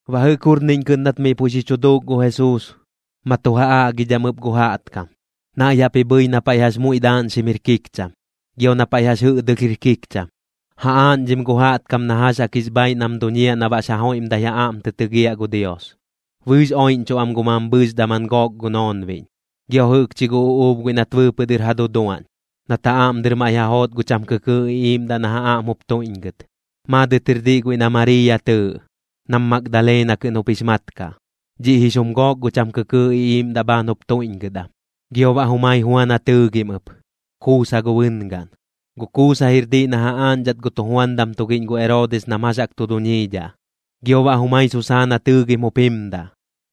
Baꞌ jɨꞌk jurniꞌñ kɨꞌn nat miꞌ puiꞌ xi chu duuk gu Jesuus, ma tu ja aꞌgidham ɨp gu jaꞌtkam. Naiꞌ jaꞌp ji bhɨi na paiꞌ jax muiꞌ daaꞌñxim jir kikcham, gio na paiꞌ jax jɨꞌdɨlh jir kikcham, ja aaꞌñdhim gu jaꞌtkam na jax jaꞌk jix bhaaiꞌ nam duñiaꞌ na baꞌx ja joiꞌmdai ja aꞌm tɨ tɨgiaꞌ gu Dios. Bɨɨx oiꞌñchuꞌ am gu mambhɨɨx daman gook gu noonbiꞌñ, gio jɨꞌkchi gu uꞌuub guiꞌ nat bɨɨpɨꞌ dɨr ja duduaꞌñ, nat ja aꞌm dɨr maiꞌ ja joot gu cham kɨkɨɨꞌ iꞌiiꞌmdaꞌ nam ja aꞌm jup tuiꞌñgɨt. Maadɨt jir diꞌ guiꞌ na Mariiya tɨɨꞌ, nam Magdalena kɨꞌn jup jix mat kaꞌ. Dhiꞌ jix jum gook gu cham kɨkɨɨꞌ iꞌiiꞌmdaꞌ bhaan jup tuiꞌñgɨt am. Gio baꞌ jumai Juana tɨɨgɨm ɨp, Kuusa gu bɨngaꞌn. Gu Kuusa jir diꞌ na ja aaꞌñdhat gu tujuandam tugiꞌñ gu Eroodis nam jax jaꞌk tu duñiidhaꞌ. Gio baꞌ jumai Susaana tɨɨgim jup jimdaꞌ,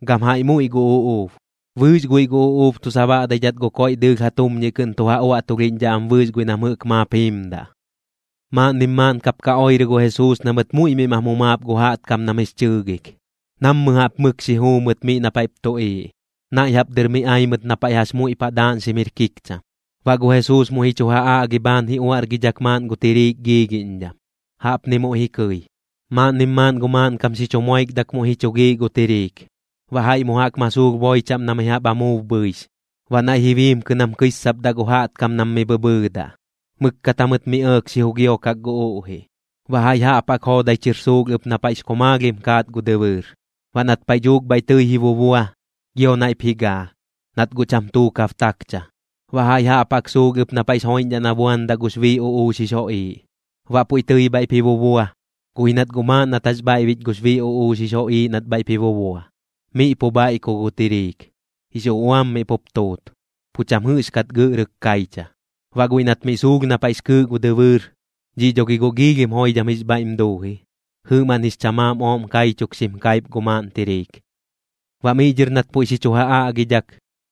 gam jaiꞌ muiꞌ gu uꞌuub. Bɨɨx guiꞌ gu uꞌuub tu sabaꞌdaidhat gu koiꞌ dɨɨlh ja tumñiꞌ kɨꞌn tu ja uaꞌtulhiꞌñdhaꞌ am bɨɨx guiꞌ nam jɨꞌk maap jiimdaꞌ. Maaꞌnnim maaꞌn kap ka oirɨ gu Jesuus na mɨt muiꞌ miꞌ mam jumaap gu jaꞌtkam nam jix chɨɨgik, nammɨ jaꞌp mɨk xi juu mɨt miꞌ na paiꞌp tuꞌiiꞌ. Naiꞌ jaꞌp dɨr mi ai mɨt na paiꞌ jax muiꞌ paꞌ daaꞌñxim jir kikcham. Baꞌ gu Jesuus muiꞌ ji chu ja aꞌgi bhaan ji uaꞌrgidhak maaꞌn gu tiriik giigiꞌñdham, jaꞌpni muiꞌ ji kɨi: ―Maaꞌnnim maaꞌn gu maaꞌnkam xi chu moikdak muiꞌ ji chu giiꞌ gu tiriik, baꞌ jaiꞌ mu jaꞌk ma suulh boi chaꞌm na mi jaꞌp amuub bhɨix. Baꞌ naiꞌ ji biimkɨ nam kɨissapdaꞌ gu jaꞌtkam nam mi bhɨbhɨɨdaꞌ, mɨkkat jamɨt mi ɇɇk xi jugiokak gu uꞌjiꞌ. Baꞌ jaiꞌ jaꞌp jaꞌk joodai chɨr suulh ɨp na paiꞌx komaalhim kaat gu dɨbɨɨr, baꞌ nat paiꞌ dhuuk bhaiꞌ tɨi ji bubua, gio naiꞌp ji gaa, nat guꞌ cham tuukab takcha. Baꞌ jaiꞌ jaꞌp jaꞌk suulh ɨp na paiꞌx joiꞌñdhaꞌ na buandaꞌ gux bii uꞌuux jix joꞌiiꞌ. Baꞌ puiꞌ tɨi bhaiꞌp ji bubua, guꞌ ji nat guꞌ maaꞌn nat jax bhaiꞌbich gux bii uꞌuux jix joꞌiiꞌ nat bhaiꞌp ji bubua, miꞌ pu bhaiꞌku gu tiriik, jix uꞌuam miꞌ pup tuut, pu cham jɨꞌxkat gɨꞌrɨk kaicha. Baꞌ guiꞌ nat miꞌ suulh na paiꞌx kɨɨꞌ gu dɨbɨɨr, dhiꞌ dho gi guꞌ giilhim joidham jix bhaiꞌm duu ji, jɨꞌmaꞌn jix chamaam ooꞌm kaichuk xim kaip gu maaꞌn tiriik. Baꞌ miꞌ dhɨr nat puiꞌ xi chu ja aꞌgidhak,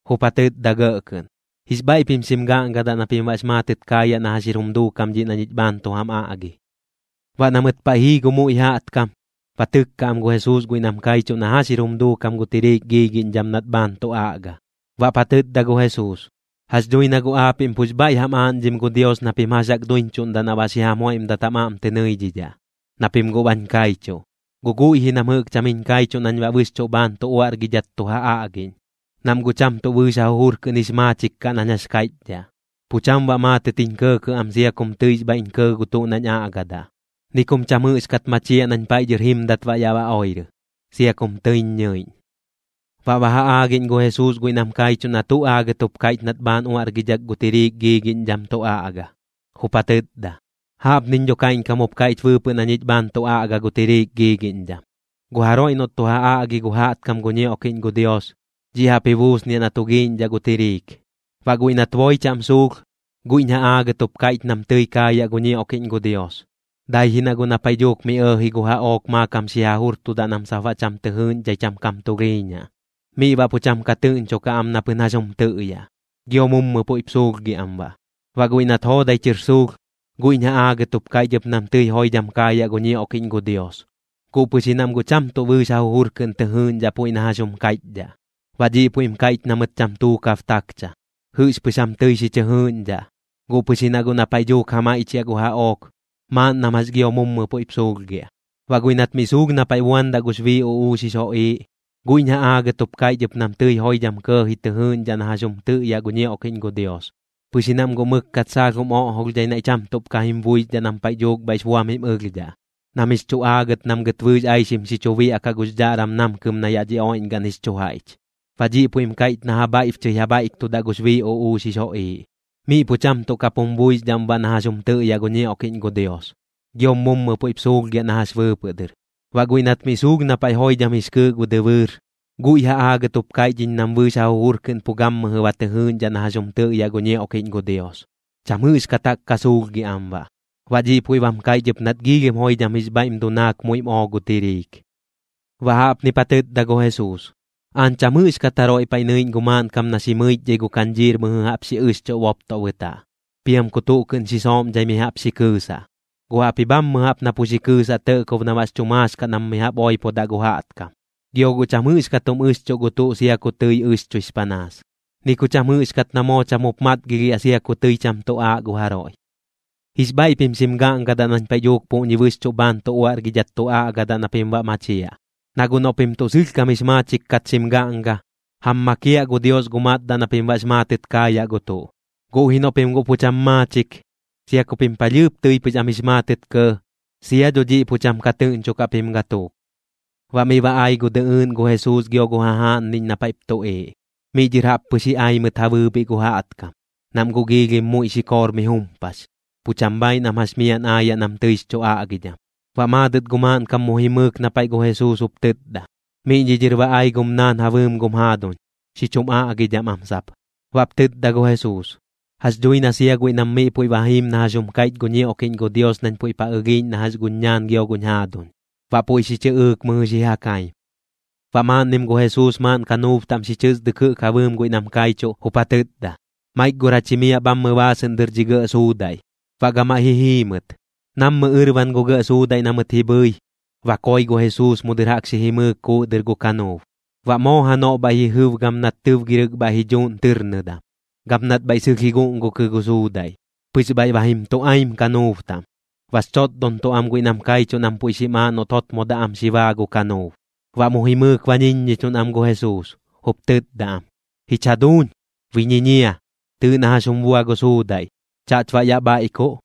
jup ja tɨtda gɇꞌ kɨꞌn: ―Jix bhaiꞌ pim xim gaꞌngadaꞌ na pim baꞌx maatɨt kaayaꞌ na jax jir jum duukam dhiꞌ na ñich bhaan tu jam aꞌgi. Baꞌ na mɨt paiꞌ jii gu muiꞌ jaꞌtkam, ba tɨkka am gu Jesuus guiꞌ nam kaichuꞌ na jax jir jum duukam gu tiriik giigiꞌñdham nat bhaan tu aꞌga. Baꞌp ja tɨtda gu Jesuus: ―Jax dhui na guꞌ aapiꞌm pux bhaiꞌ jam aaꞌñdhim gu Dios na pim jax jaꞌk duiñchuꞌndaꞌ na baꞌ xi jam joiꞌmdat jam aꞌm tɨ nɨidhidhaꞌ, na pim guꞌ bañ kaichuꞌ. Guꞌ guiꞌ ji nam jɨꞌk cham jiñ kaichuꞌ nañ baꞌ bɨxchuꞌ bhaan tu uaꞌrgidhat tu ja aꞌgiꞌñ, nam guꞌ cham tuꞌ bɨɨx ja jujur kɨꞌn jix maachik kaꞌ nañ jax kaiꞌchdhaꞌ. Pu cham baꞌ maatɨt jiñ kɇɇkɇꞌ am sia kum tɨix bhaiꞌñ kɇɇ gu tuꞌ nañ aꞌgadaꞌ, ni kum cham jɨꞌxkat machiaꞌ nañ paiꞌ dhɨr jimdat baꞌ ya oirɨ, sia kum tɨiñ ñɨiꞌñ. Baꞌ ba ja aagiꞌñ gu Jesuus guiꞌ nam kaichuꞌ na tuꞌ aagɨt jup kaiꞌch nat bhaan uaꞌrgidhak gu tiriik giigiꞌñdham tu aꞌga. Jup ja tɨtda: ―Jaꞌpniñ dho kaiꞌñkam jup kaiꞌch bɨɨpɨꞌ na ñich bhaan tu aꞌga gu tiriik giigiꞌñdham. Gu jaroiꞌ noꞌt tu ja aꞌgi gu jaꞌtkam gu ñioꞌkiꞌñ gu Dios, dhiꞌ jaꞌp ji buusniaꞌ na tu giiꞌñdhaꞌ gu tiriik. Baꞌ guiꞌ nat boi chaꞌm suulh, guiꞌñ ja aagɨt jup kaiꞌch nam tɨi kaayaꞌ gu ñioꞌkiꞌñ gu Dios, dai ji na guꞌ na paiꞌ dhuuk mi ɇɇji gu jaꞌook maakam xi ja jurtudaꞌ nam sap baꞌ cham tɨ jɨɨꞌñdhai cham kam tulhiiñaꞌ, miꞌ baꞌ pu cham ka tɨꞌñchokaꞌ am na pɨn jax jum tɨꞌyaꞌ, gio mummɨ puiꞌp suulhgiaꞌ am baꞌ. Baꞌ guiꞌ nat joodai chɨr suulh, guiꞌñ ja aagɨt jup kaiꞌch ɨp nam tɨi joidham kaayaꞌ gu ñioꞌkiꞌñ gu Dios, guꞌ pɨx ji nam guꞌ cham tuꞌ bɨɨx ja jujur kɨꞌn tɨ jɨɨgiꞌñdhaꞌ puiꞌ na jax jum kaiꞌchdhaꞌ, baꞌ dhiꞌ puiꞌm kaiꞌch na mɨt cham tuukab takcha. Jɨꞌxpɨx jam tɨi xi chɨ jɨɨgiꞌñdhaꞌ, guꞌ pɨx ji na guꞌ na paiꞌ dhuuk ja maiꞌchiaꞌ gu jaꞌook, maaꞌn nam jax gio mummɨ puiꞌp suulhgiaꞌ. Baꞌ guiꞌ nat miꞌ suulh na paiꞌ buandaꞌ gux bii uꞌuux jix joꞌiiꞌ, guiꞌñ ja aagɨt jup kaiꞌch ɨp nam tɨi joidham kɇɇji tɨ jɨɨꞌñdhaꞌ na jax jum tɨꞌyaꞌ gu ñioꞌkiꞌñ gu Dios, pɨx ji nam guꞌ mɨkkat saalh jum oꞌjolhdhai naiꞌ cham tuꞌp ka jim buixdhaꞌ nam paiꞌ dhuuk bhaiꞌx buam jim ɨlhdhaꞌ, nam jix chu aagɨt nam gɨt bɨɨx aixim tuꞌm xi chu biaꞌkaꞌ gux dhaꞌram namkɨm na yaꞌ dhi oiꞌñgaꞌn jix chu jaiꞌch, baꞌ dhiꞌ puiꞌm kaiꞌch na ja bhaiꞌbchɨi ja bhaiꞌktudaꞌ gux bii uꞌuux jix joꞌiiꞌ. Miꞌ pu cham tuꞌ kap jum buixdhaꞌm baꞌ na jax jum tɨꞌyaꞌ gu ñioꞌkiꞌñ gu Dios, giom mummɨ puiꞌp suulhgiaꞌ na jax bɨɨpɨꞌ dɨr. Baꞌ guiꞌ nat miꞌ suulh na paiꞌ joidham jix kɨɨꞌ gu dɨbɨɨr, guiꞌ ja aagɨt jup kaiꞌch iñ nam bɨɨx ja jujur kɨꞌn pu gammɨjɨ ba tɨ jɨɨꞌñdhaꞌ na jax jum tɨꞌyaꞌ gu ñioꞌkiꞌñ gu Dios, cham jɨꞌxkat jaꞌk ka suulhgiaꞌ am baꞌ. Baꞌ dhiꞌ puiꞌ bam kaiꞌch ɨp nat giilhim joidham jix bhaiꞌm dunaak muiꞌm oo gu tiriik. Baꞌ jaꞌpnip ja tɨtda gu Jesuus: ―Aañ cham jɨꞌxkat jaroiꞌ paiꞌ nɨiꞌñ gu maaꞌnkam na xi mɨichdhai gu kañdhiir mɨjɨ jaꞌp xi ɨxchuꞌ boptoꞌ bɨtaꞌ, piam ku tuꞌ kɨꞌn xi sooꞌmdhai mi jaꞌp xi kɨɨsaꞌ. Guꞌ jaꞌpji bhammɨ jaꞌp na pu xi kɨɨsaꞌ tɇꞌkob na baꞌx chu maax kaꞌ nam mi jaꞌp oipodaꞌ gu jaꞌtkam. Gio guꞌ cham jɨꞌxkat jum ɨxchuꞌ gu tuꞌ sia ku tɨi ɨxchuix panaas, ni ku cham jɨꞌxkat na moo cham jup matgilhiaꞌ sia ku tɨi cham tu aaꞌ gu jaroiꞌ. ’Jix bhaiꞌ pim xim gaꞌngadaꞌ nañ paiꞌ dhuuk puꞌñi bɨxchuꞌ bhaan tu uaꞌrgidhat tu aꞌgadaꞌ na pim baꞌ machiaꞌ. Na guꞌ noꞌ pim tuꞌ sɨlhkam jix maachik kat xim gaꞌnga, jam makiaꞌ gu Dios gu matdaꞌ na pim baꞌx maatɨt kaayaꞌ gu tuꞌ. Guꞌ ji noꞌ pim guꞌ pu cham maachik, sia ku pim palhɨɨp tɨi pɨx am jix maatɨt kɇɇ, sia dho dhiꞌ pu cham ka tɨꞌñchokaꞌ pim gatuuk. Baꞌ miꞌ ba ai gu dɨꞌɨɨꞌn gu Jesuus gio gu jajaaꞌnniꞌñ na paiꞌp tuꞌiiꞌ. Miꞌ dhɨr jaꞌp pɨx ji ai mɨt ja bɨɨbhiꞌ gu jaꞌtkam, nam guꞌ giilhim muiꞌ xikoor mi jumpax, pu cham bhaaiꞌ nam jax miaꞌn aayaꞌ nam tɨix chu aꞌgidham. Baꞌ maadɨt gu maaꞌnkam mu jimɨɨk na paiꞌ gu Jesuus, jup tɨtda: ―Miꞌñi dhɨr ba ai gum naan ja bɨɨm gum jaaduñ, xi chum aꞌgidham am sap. Baꞌp tɨtda gu Jesuus: ―Jax dhui na sia guiꞌ nam miꞌ puiꞌ ba jiim na jax jum kaiꞌch gu ñioꞌkiꞌñ gu Dios nañ puiꞌp ja ɨlhiiꞌñ na jax guñ ñaan gio guñ jaaduñ. Baꞌ puiꞌ xi chɨꞌɨɨk mɨjɨ xi ja kaim. Baꞌ maaꞌnnim gu Jesuus maaꞌn kanuub taꞌm xi chɨsdɨk jɨꞌk ja bɨɨm guiꞌ nam kaichuꞌ, jup ja tɨtda: ―Maik gor jach jimiaꞌ bhammɨ baasɨꞌn dɨr dhi gɇꞌ suudaiꞌ. Baꞌ gamaiꞌ ji jii mɨt. Nammɨ ɨrban gu gɇꞌ suudaiꞌ na mɨt ji bhɨi, ba koi gu Jesuus mu dɨr jaꞌk xi jimɨɨk kuuꞌ dɨr gu kanuub. Baꞌ moo janoꞌ bhaiꞌ ji jɨb gam nat tɨbgirɨk bhaiꞌ ji dhuuꞌn tɨrnɨdam, gam nat bhaiꞌ sɨlh ji guꞌngukɨ gu suudaiꞌ, pɨx bhaiꞌ ba jim tu aim kanuub taꞌm. Bax chotdontuꞌ am guiꞌ nam kaichuꞌ nam puiꞌ xim aaꞌ noꞌt jotmodaꞌ am xi baa gu kanuub. Baꞌ mu jimɨɨk ba ñiññichuꞌn am gu Jesuus, jup tɨtda am: ―Jich jaduuñ, bi ñiñia. Tɨɨꞌ na jax jum bua gu suudaiꞌ. ¿Chaꞌch baꞌ yaꞌ bhaiꞌkuꞌ?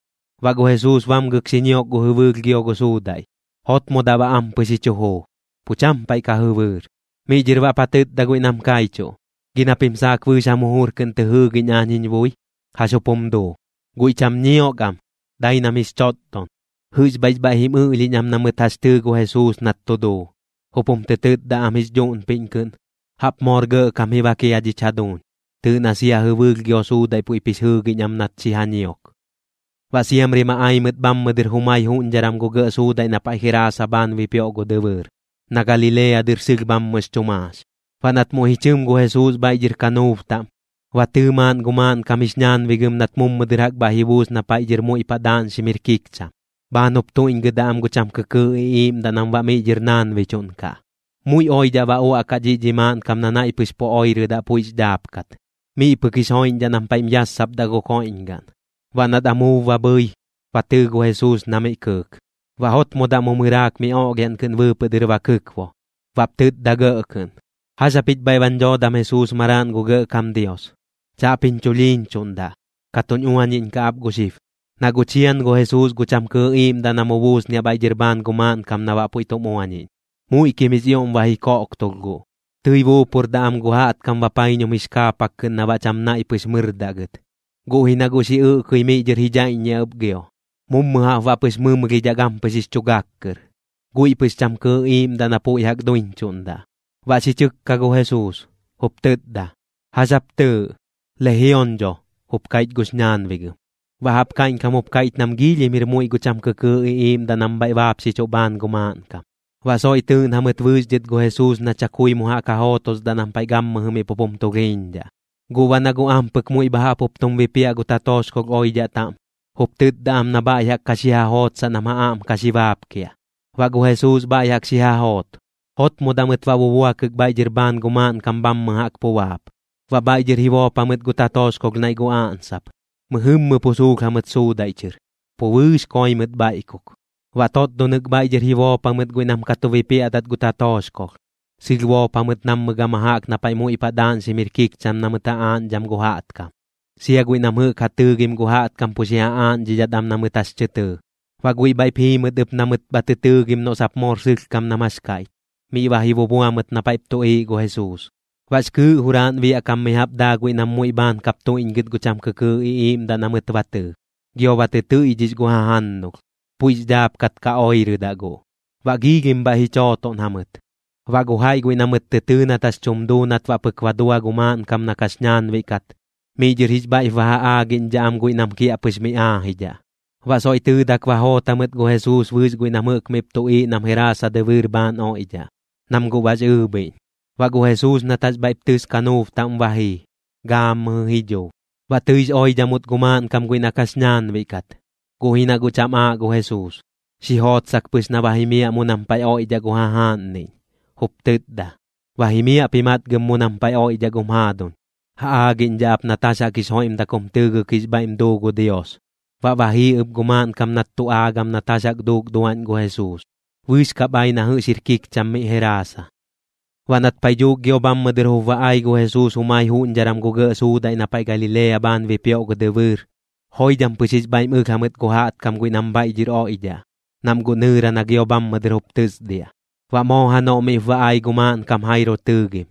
Baꞌ gu Jesuus bamgɨk xi ñiok gu jɨbɨɨlh gio gu suudaiꞌ, jotmodaꞌ baꞌ ampɨx jup ji chu juu, pu cham paiꞌ ka jɨbɨɨr. Miꞌ dhɨr baꞌp ja tɨtda guiꞌ nam kaichuꞌ: ―¿Gi na pim saak bɨɨx jam jujur kɨꞌn tɨ jɨɨgiꞌñ aañ jiñ bui? ¿Jax jup jum duu? Guiꞌ cham ñiok am, dai nam jix chotdon, jɨꞌx bhaiꞌx bhaiꞌ jim ɨlhiiꞌñ na mɨt jax tɨɨ gu Jesuus nat tu duu, jup jum tɨ tɨtda am jix dhuꞌnpiꞌñ kɨꞌn: ―Jaꞌp moor gɇꞌkam ji bak jia dhich jaduuñ. Tɨɨꞌ na sia jɨbɨɨlh gio suudaiꞌ puiꞌp jix jɨɨgiꞌñ am nat xi ja ñiok. Baꞌ siamri ma ai mɨt bhammɨ dɨr jumai juꞌñdharam gu gɇꞌ suudaiꞌ na paiꞌ Geraasa bhaan bipioꞌ gu dɨbɨɨr, na Galilea dɨr sɨlh bhammɨx chu maax. Baꞌ nat muiꞌ ji chɨm gu Jesuus bhaiꞌ dhɨr kanuub taꞌm, ba tɨɨ maaꞌn gu maaꞌnkam jix ñaanbigɨm nat mummɨ dɨr jaꞌk bhaiꞌ ji buus na paiꞌ dhɨr muiꞌ paꞌ daaꞌñxim jir kikcham, bhaan jup tuiꞌñgɨdaꞌ am gu cham kɨkɨɨꞌ iꞌiiꞌmdaꞌ nam baꞌ miꞌ dhɨr naanbichuꞌn kaꞌ. Muiꞌ oidhaꞌ ba uaꞌkaꞌ dhiꞌ dhi maaꞌnkam na naiꞌ pɨx pu oirɨdaꞌ puiꞌx dhaapkat. Miꞌ pɨk jix joiꞌñdhaꞌ nam paiꞌm yassapdaꞌ gu koiꞌñgaꞌn. Baꞌ nat amuub ba bhɨi, ba tɨɨ gu Jesuus na miꞌ kɨɨk. Baꞌ jotmodaꞌ mu mɨraak mi oꞌlhiaꞌn kɨꞌn bɨɨpɨꞌ dɨr ba kɨkbo, baꞌp tɨtda gɇꞌ kɨꞌn: ―¿Jax japich bhaiꞌ bañ dhoodam Jesuus maraaꞌn gu Gɇꞌkam Dios? Chaꞌp jiñ chulhiiñchuꞌndaꞌ. Ka tuñ uañiꞌñkaꞌ ap gu xib. Na guꞌ chian gu Jesuus gu cham kɨɨꞌ iiꞌmdaꞌ na mu buusniaꞌ bhaiꞌ dhɨr bhaan gu maaꞌnkam na baꞌ puiꞌ tum uañiꞌñ. Muiꞌkim jix ioꞌm ba ji koꞌktulh guꞌ, tɨi buupurdaꞌ am gu jaꞌtkam bapaiñum jix kaapak kɨꞌn na baꞌ cham naiꞌ pɨx mɨrdaꞌ gɨt, guꞌ ji na guꞌ xi ɨꞌkɨi miꞌ dhɨr ji dhaiꞌññiaꞌ ɨp gio, mummɨ jaꞌp baꞌ pɨx mɨmlhidhaꞌ gampɨx jix chu gak kɨr. Guiꞌ pɨx cham kɨɨꞌ iiꞌmdaꞌ na puiꞌ jaꞌk duiñchuꞌndaꞌ. Baꞌ xi chɨkka gu Jesuus, jup tɨtda: ―¿Jax jap tɨɨꞌ? ―Lejion dho ―jup kaiꞌch gux ñaanbigɨm. Baꞌ jaꞌp kaiꞌñkam jup kaiꞌch nam giilhim jir muiꞌ gu cham kɨkɨɨꞌ iꞌiiꞌmdaꞌ nam bhaiꞌ baapxichuꞌ bhaan gu maaꞌnkam. Baꞌ soiꞌ tɨɨꞌn jamɨt bɨɨx dhɨt gu Jesuus na chakui mu jaꞌk ja jootosdaꞌ nam paiꞌ gammɨjɨ miꞌ pup jum tulhiiñdhaꞌ. Guꞌ baꞌ na guꞌ ampɨk muiꞌ bha jaꞌp jup tum bipiaꞌ gu tatooxkolh oidhaꞌ taꞌm, jup tɨtda am na bhaiꞌ jaꞌk ka xi ja jootsaꞌ nam ja aꞌm ka xi baapkiaꞌ. Baꞌ gu Jesuus bhaiꞌ jaꞌk xi ja joot. Jotmodaꞌ mɨt baꞌ bubuakɨk bhaiꞌ dhɨr bhaan gu maaꞌnkam bhammɨ jaꞌk pu baap. Baꞌ bhaiꞌ dhɨr ji boop jamɨt gu tatooxkolh naiꞌ gu aꞌnsap, mɨjɨmmɨ pu suulh jamɨt suudaiꞌ chɨr, pu bɨɨx koi mɨt bhaiꞌkuk. Baꞌ totdonɨk bhaiꞌ dhɨr jup ji boop jamɨt guiꞌ nam ka tu bipiaꞌdat gu tatooxkolh, sɨlh boop jamɨt nammɨ gama jaꞌk na paiꞌ muiꞌ paꞌ daaꞌñxim jir kikcham na mɨt ja aaꞌñdham gu jaꞌtkam, sia guiꞌ nam jɨꞌk ja tɨɨgim gu jaꞌtkam pu xi ja aaꞌñdhidhat am na mɨt jax tɨ tɨɨ. Baꞌ guiꞌ bhaiꞌp jii mɨt ɨp na mɨt bha tɨ tɨɨgim noꞌ sap moor sɨlhkam nam jax kaiꞌch, miꞌ ba ji bubua mɨt na paiꞌp tuꞌiiꞌ gu Jesuus. Baꞌx kɨɨꞌ juraaꞌn biaꞌ kam mi jaꞌp daa guiꞌ nam muiꞌ bhaan kap tuiꞌñgɨt gu cham kɨkɨɨꞌ iꞌiiꞌmdaꞌ na mɨt ba tɨɨ, gio ba tɨ tɨiꞌdhix gu jajannulh, puiꞌx dhaapkat ka oirɨdaꞌ guꞌ. Baꞌ giilhim bhaiꞌ ji chootoꞌn jamɨt. Baꞌ gu jaiꞌ guiꞌ na mɨt tɨ tɨɨ nat jax tum duu nat baꞌ pɨk ba dua gu maaꞌnkam na kax ñaanbiꞌ kat, miꞌ dhɨr jix bhaiꞌp ba ja aaꞌñdhidhaꞌ am guiꞌ nam kiaꞌpɨx mi aajidhaꞌ. Baꞌ soiꞌ tɨɨdak ba joot jamɨt gu Jesuus bɨɨx guiꞌ nam jɨꞌk miꞌp tuꞌiiꞌ nam Geraasa dɨbɨɨr bhaan oiꞌdhaꞌ, nam guꞌ bax ɨɨbhiꞌñ. Baꞌ gu Jesuus nat jax bhaiꞌp tɨs kanuub taꞌm ba jii, gaammɨjɨ ji dhuu. Baꞌ tɨix oidhamut gu maaꞌnkam guiꞌ na kax ñaanbiꞌ kat, guꞌ ji na guꞌ cham aaꞌ gu Jesuus. Xi jootsak pɨx na ba jimiaꞌ mu nam paiꞌ oiꞌdhaꞌ gu jajaaꞌnniꞌñ, jup tɨtda: ―Ba jimiaꞌp ji matgɨm mu nam paiꞌ oiꞌdhaꞌ gum jaaduñ. Ja aagiꞌñdhaꞌ ap nat jax jaꞌk jix joiꞌmdak jum tɨɨgɨk jix bhaiꞌm duu gu Dios. Baꞌ ba jii ɨp gu maaꞌnkam nat tu aagam nat jax jaꞌk duuk duaꞌñ gu Jesuus. Bɨɨx kap ai na jɨꞌx jir kikcham miꞌ Geraasa. Baꞌ nat paiꞌ dhuuk gio bhammɨ dɨr jup ba ai gu Jesuus jumai juꞌñdharam gu gɇꞌ suudaiꞌ na paiꞌ Galilea bhaan bipioꞌ gu dɨbɨɨr, joidham pɨx jix bhaiꞌm ɨlh jamɨt gu jaꞌtkam guiꞌ nam bhaiꞌ dhɨr oiꞌdhaꞌ, nam guꞌ nɨɨra na gio bhammɨ dɨr jup tɨsdiaꞌ. Baꞌ moo janoꞌ miꞌp ba ai gu maaꞌnkam Jairo tɨɨgim.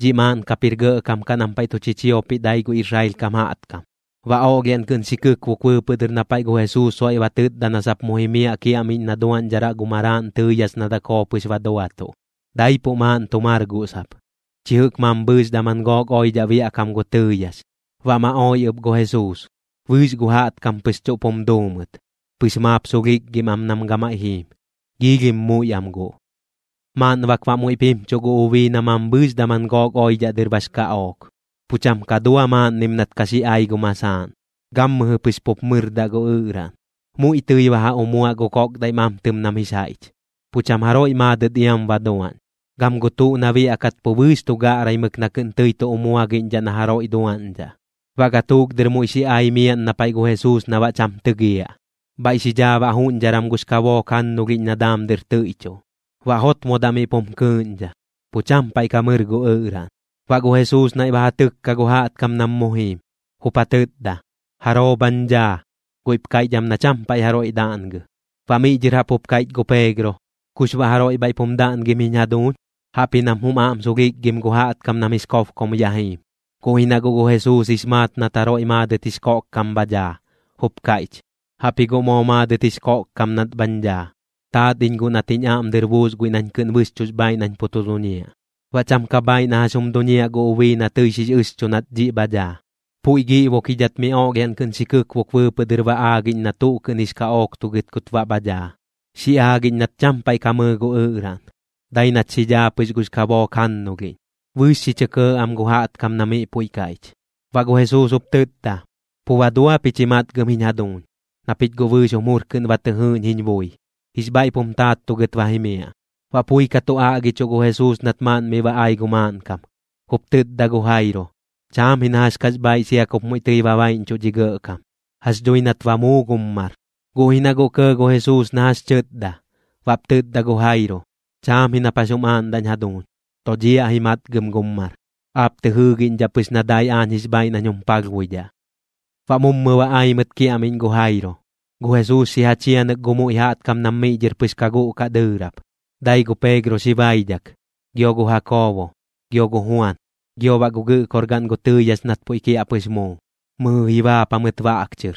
Dhiꞌ maaꞌn kap jir gɇꞌkam kaꞌ nam paiꞌ tu chichiopiꞌ dai gu Israel kam jaꞌtkam. Baꞌ oꞌlhiaꞌn kɨꞌn xi kɨkbok bɨɨpɨꞌ dɨr na paiꞌ gu Jesuus soiꞌ ba tɨtda na sap iam mu jimiaꞌ kiaꞌmiꞌñ na duaꞌñdharaꞌ gu maraaꞌn tɨɨyax na dakoo pɨx ba duatuꞌ. Daipuꞌ maaꞌn tu mar guꞌ sap, chi jɨꞌk mambhɨɨx daman gook oidhaꞌ biaꞌkam gu tɨɨyax. Baꞌ ma oi ɨp gu Jesuus, bɨɨx gu jaꞌtkam pɨx chuꞌp jum duu mɨt, pɨx maap sulhikgim am nam gamaiꞌ jiim, giilhim muiꞌ am guꞌ. Maaꞌn bak baꞌ muiꞌp jimchuꞌ gu ubii na mambhɨɨx daman gook oidhaꞌ dɨr bax kaꞌook. Pu cham ka dua maaꞌnnim nat ka xi ai gu masaaꞌn, gammɨjɨ pɨx pup mɨrdaꞌ gu ɨꞌraꞌn. Muiꞌ tɨi ba ja umuaꞌ gu koꞌkdaiꞌ mamtɨm nam jix jaiꞌch, pu cham jaroiꞌ maadɨt iam ba duaꞌñ. Gam gu tuꞌ na biaꞌkat pu bɨɨx tu gaꞌraimɨk na kɨꞌn tɨi tu umuagiꞌñdhaꞌ na jaroiꞌ duaꞌñdhaꞌ. Baꞌ gatuuk dɨr muiꞌ xi ai miaꞌn na paiꞌ gu Jesuus na baꞌ cham tɨgiaꞌ, bhaiꞌ xi dhaa baꞌ juꞌñdharam gux kabook jannulhiꞌñ na daam dɨr tɨiꞌchuꞌ. Baꞌ jotmodaꞌ miꞌ pum kɨɨꞌñdha, pu cham paiꞌ ka mɨr gu ɨꞌraꞌn. Baꞌ gu Jesuus naiꞌ ba ja tɨkka gu jaꞌtkam nam mu jiim, jup ja tɨtda: ―¿Jaroo bhañ dhaa? Guiꞌp kaiꞌch am na cham paiꞌ jaroiꞌ daꞌngɨ. Baꞌ miꞌ dhɨr jaꞌp jup kaiꞌch gu Peegro: ―¿Kux baꞌ jaroiꞌ bhaiꞌp jum daꞌngim jiñ jaduuñ? Jaꞌpji nam jum aꞌm sulhikgim gu jaꞌtkam nam jix kobkom ya jiim. Guꞌ ji na guꞌ gu Jesuus jix maat nat jaroiꞌ maadɨt jix koꞌkkam bha dhaa, jup kaiꞌch: ―Jaꞌpji guꞌ moo maadɨt jix koꞌkkam nat bhañ dhaa, taat iñ guꞌ nat jiñ aꞌm dɨr buus guiꞌ nañ kɨꞌn bɨxchuꞌx bhaaiꞌ nañ pu tu duñiaꞌ. Baꞌ cham ka bhaaiꞌ na jax jum duñiaꞌ gu ubii na tɨi xix ɨxchu nat dhiꞌ bha dhaa, puiꞌ giꞌbokidhat mi oꞌlhiaꞌn kɨꞌn xi kɨkbok bɨɨpɨꞌ dɨr ba aagiꞌñ na tuꞌ kɨꞌn jix kaꞌooktugɨt kut baꞌ bha dhaa, xi aagiꞌñ nat cham paiꞌ ka mɨɨ gu ɨꞌraꞌn, dai nat xi dhaa pɨx gux kabook jannulhiꞌñ. Bɨɨx xi chɇ kɇɇ am gu jaꞌtkam na miꞌ puiꞌ kaiꞌch. Baꞌ gu Jesuus jup tɨtda: ―Pu ba dua pich ji matgɨm jiñ jaduuñ, na pich guꞌ bɨɨx jum jur kɨꞌn ba tɨ jɨɨꞌñ jiñ bui. Jix bhaiꞌp jum taattugɨt ba jimiaꞌ. Baꞌ pui ka tu aꞌgichuꞌ gu Jesuus nat maaꞌn miꞌ ba ai gu maaꞌnkam, jup tɨtda gu Jairo: ―Cham ji na jax kax bhaaiꞌ sia kup muiꞌ tɨi ba baiꞌñchuꞌ dhi gɇꞌkam, jax dhui nat ba muu gum mar. Guꞌ ji na guꞌ kɇɇ gu Jesuus na jax tɨtda, baꞌp tɨtda gu Jairo: ―Chaam ji nap jax jum aaꞌndaꞌñ jaduuñ, dodhiaꞌ ji matgɨm gum mar. Aap tɨ jɨɨgiꞌñdhaꞌ pɨx na dai aañ jix bhaaiꞌ nañ jum palhbuidhaꞌ. Baꞌ mummɨ ba ai mɨt kiaꞌmiꞌñ gu Jairo. Gu Jesuus xi ja chianɨk gu muiꞌ jaꞌtkam nam miꞌ dhɨr pɨx ka guꞌkaꞌ dɨɨrap. Dai gu Peegro xi baidhak, gio gu Jakoobo, gio gu Juan, gio baꞌ gu gɨꞌkorgaꞌn gu tɨɨyax nat puiꞌ kiaꞌpɨx muu, mɨjɨ ji baap jamɨt baꞌ baꞌk chɨr.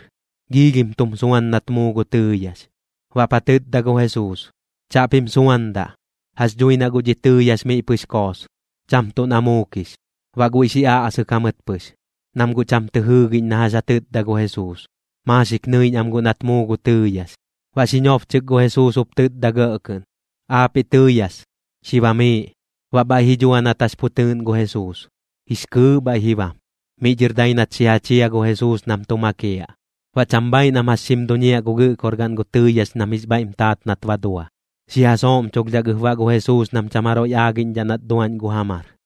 Giilhim tum suan nat muu gu tɨɨyax. Baꞌp ja tɨtda gu Jesuus: ―Chaꞌpim suandaꞌ. Jax dhui na guꞌ dhi tɨɨyax miꞌ pɨx koos, cham tuꞌ na muukix. Baꞌ guiꞌ xi aꞌsɨk jamɨt pɨx, nam guꞌ cham tɨ jɨɨgiꞌñ na jax ja tɨtda gu Jesuus, maaxik nɨiꞌñ am guꞌ nat muu gu tɨɨyax. Baꞌ xi nobchɨk gu Jesuus jup tɨtda gɇꞌ kɨꞌn: ―Aapiꞌ tɨɨyax, xi bamiiꞌ. Baꞌ bhaiꞌ ji dhua nat jax pu tɨɨꞌn gu Jesuus, jix kɨɨꞌ bhaiꞌ ji bam. Miꞌ dhɨr dai nat xi ja chia gu Jesuus nam tu makiaꞌ. Baꞌ cham bhaaiꞌ nam jax xim duñiaꞌ gu gɨꞌkorgaꞌn gu tɨɨyax nam jix bhaiꞌm taat nat ba dua. Xi ja sooꞌmchulhdhak ɨp baꞌ gu Jesuus nam cham jaroiꞌ aagiꞌñdhaꞌ nat duaꞌñ gu ja mar.